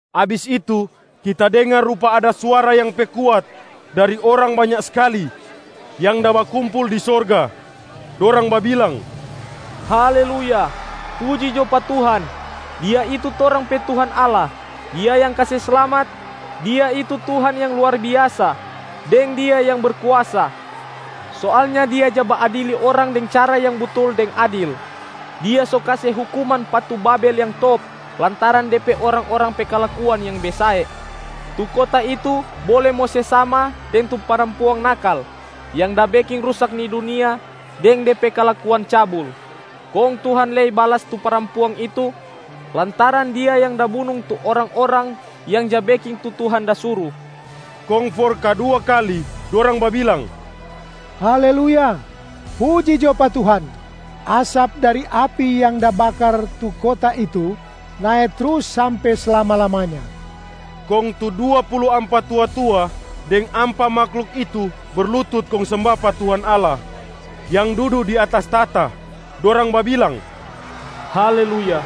Abis itu, kita dengar rupa ada suara yang pe kuat dari orang banya skali yang da bakumpul di sorga, dorang babilang, “Haleluya, puji jo pa Tuhan! Dia itu torang pe Tuhan Allah, Dia yang kase slamat, Dia itu Tuhan yang luar biasa, deng Dia yang berkuasa! Soalnya Dia ja baadili orang deng cara yang butul deng adil. Dia so kase hukuman pa tu Babel yang top lantaran de pe orang-orang pe kalakuan yang besae. Tu kota itu bole mo se sama deng tu parampuang nakal, yang da beking rusak ni dunia deng de pe kalakuan cabul. Kong Tuhan lei balas tu parampuang itu, lantaran dia yang da bunung tu orang-orang yang ja beking tu Tuhan da suru.” Kong for kadua kali dorang babilang, “Haleluya, puji jo pa Tuhan! Asap dari api yang da bakar tu kota itu nae trus sampe slama-lamanya!” Kong tu dua pulu ampa tua-tua deng ampa mahluk itu berlutut kong semba pa Tuhan Allah yang dudu di atas tahta, dorang babilang, “Haleluya,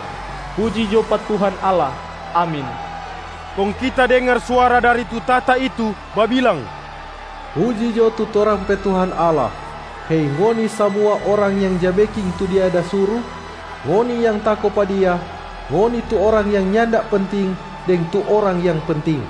puji jo pa Tuhan Allah! Amin.” Kong kita dengar suara dari tu tahta itu babilang, “Puji jo tu torang pe Tuhan Allah, hei ngoni samua orang yang ja beking tu Dia da suru, ngoni yang tako pa Dia, ngoni tu orang yang nyanda penting deng tu orang yang penting.”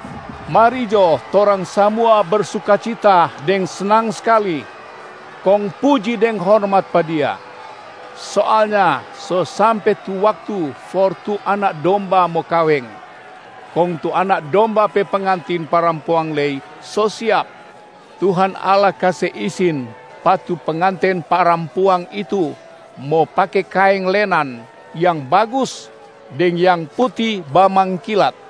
“Mari jo torang samua bersukacita deng snang skali, kong puji deng hormat pa Dia. Soalnya so sampe tu waktu for tu Anak Domba mo kaweng, kong tu Anak Domba pe pengantin parampuang lei so siap. Tuhan Allah kase isin pa tu pengantin parampuang itu mo pake kaeng lenan yang bagus deng yang puti bamangkilat.”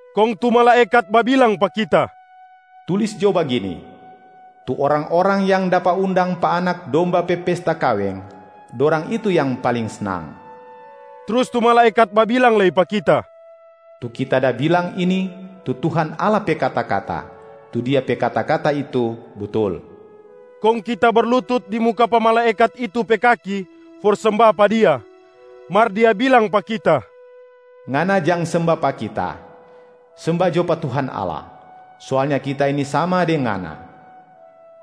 Kong tu malaekat babilang pa kita, “Tulis jo bagini, ‘Tu orang-orang yang dapa undang pa Anak Domba pe pesta kaweng, dorang itu yang paling snang.’” Trus tu malaekat babilang lei pa kita, “Tu kita da bilang ini tu Tuhan Allah pe kata-kata, tu Dia pe kata-kata itu butul.” Kong kita berlutut di muka pa malaekat itu pe kaki for semba pa dia, mar dia bilang pa kita, “Ngana jang semba pa kita! Semba jo pa Tuhan Allah! Soalnya kita ini sama deng ngana,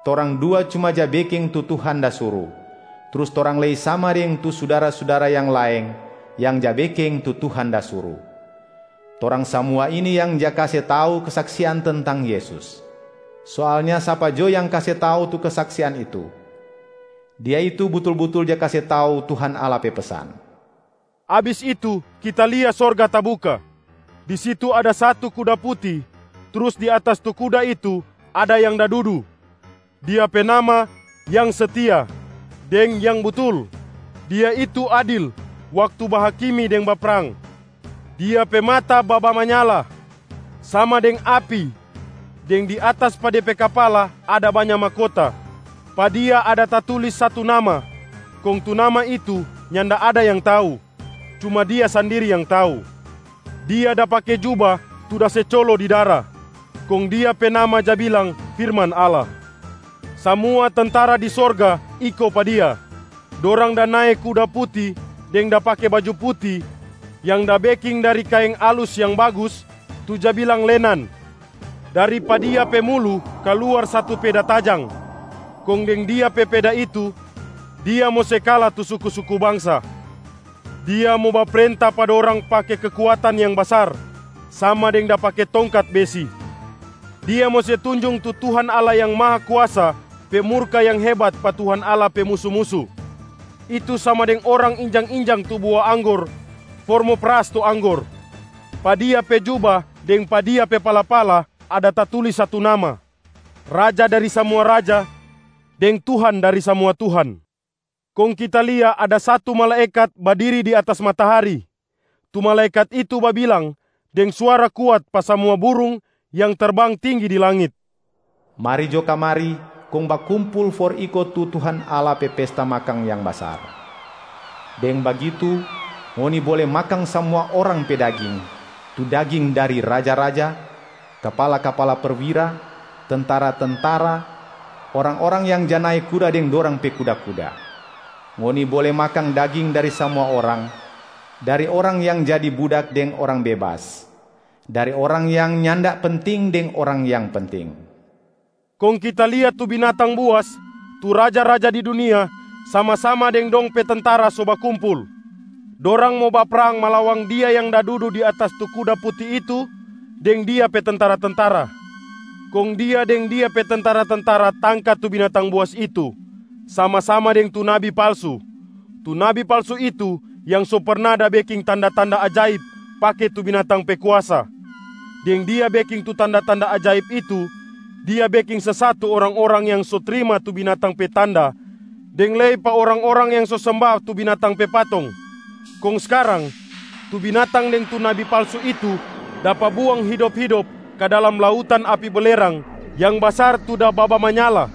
torang dua cuma ja beking tu Tuhan da suru, trus torang lei sama deng tu sudara-sudara yang laeng yang ja beking tu Tuhan da suru. Torang samua ini yang ja kase tau kesaksian tentang Yesus. Soalnya sapa jo yang kase tau tu kesaksian itu, dia itu butul-butul ja kase tau Tuhan Allah pe pesan.” Abis itu kita lia sorga tabuka, di situ ada satu kuda puti, trus di atas tu kuda itu ada yang da dudu, Dia pe nama ‘Yang Setia’ deng ‘Yang Butul’. Dia itu adil waktu bahakimi deng baprang. Dia pe mata babamanyala sama deng api, deng di atas pa De pe kapala ada banya mahkota. Pa Dia ada tatulis satu nama, kong tu nama itu nyanda ada yang tau, cuma Dia sandiri yang tau. Dia da pake juba tu da se colo di dara, kong Dia pe nama ja bilang ‘Firman Allah’. Samua tentara di sorga iko pa Dia. Dorang da nae kuda puti deng da pake baju puti yang da beking dari kaeng alus yang bagus tu ja bilang lenan. Dari pa Dia pe mulu kaluar satu peda tajang, kong deng Dia pe peda itu, Dia mo se kala tu suku-suku bangsa. Dia mo baprenta pa dorang pake kekuatan yang basar sama deng da pake tongkat besi. Dia mo se tunjung tu Tuhan Allah Yang Mahakuasa pe murka yang hebat pa Tuhan Allah pe musu-musu, itu sama deng orang injang-injang tu bua anggor for mo peras tu anggor. Pa Dia pe juba deng pa Dia pe pala-pala ada tatulis satu nama, ‘Raja dari samua raja, deng Tuhan dari samua tuhan.’ Kong kita lia satu malaekat badiri di atas matahari. Tu malaekat itu babilang deng suara kuat pa samua burung yang terbang tinggi di langit, “Mari jo kamari kong bakumpul for iko tu Tuhan Allah pe pesta makang yang basar! Deng bagitu ngoni bole makang samua orang pe daging, tu daging dari: raja-raja, kapala-kapala perwira, tentara-tentara, orang-orang yang ja nae kuda deng dorang pe kuda-kuda. Ngoni bole makang daging dari samua orang: dari orang yang jadi budak deng orang bebas, dari orang yang nyanda penting deng orang yang penting.” Kong kita lia tu binatang buas, tu raja-raja di dunia sama-sama deng dong pe tentara so bakumpul. Dorang mo baprang malawang Dia yang da dudu di atas tu kuda puti itu deng Dia pe tentara-tentara. Kong Dia deng Dia pe tentara-tentara tangka tu binatang buas itu sama-sama deng tu nabi palsu. Tu nabi palsu itu yang so perna da beking tanda-tanda ajaib pake tu binatang pe kuasa. Deng dia beking tu tanda-tanda ajaib itu, dia beking sesat tu orang-orang yang so trima tu binatang pe tanda deng lei pa orang-orang yang so semba tu binatang pe patong. Kong skarang, tu binatang deng tu nabi palsu itu dapa buang hidop-hidop ka dalam lautan api belerang yang basar tu da babamanyala.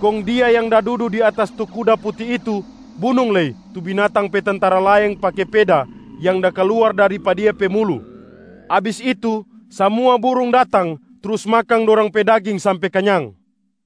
Kong Dia yang da dudu di atas tu kuda puti itu bunung lei tu binatang pe tentara laeng pake peda yang da kaluar dari pa Dia pe mulu. Abis itu, samua burung datang trus makang dorang pe daging sampe kanyang.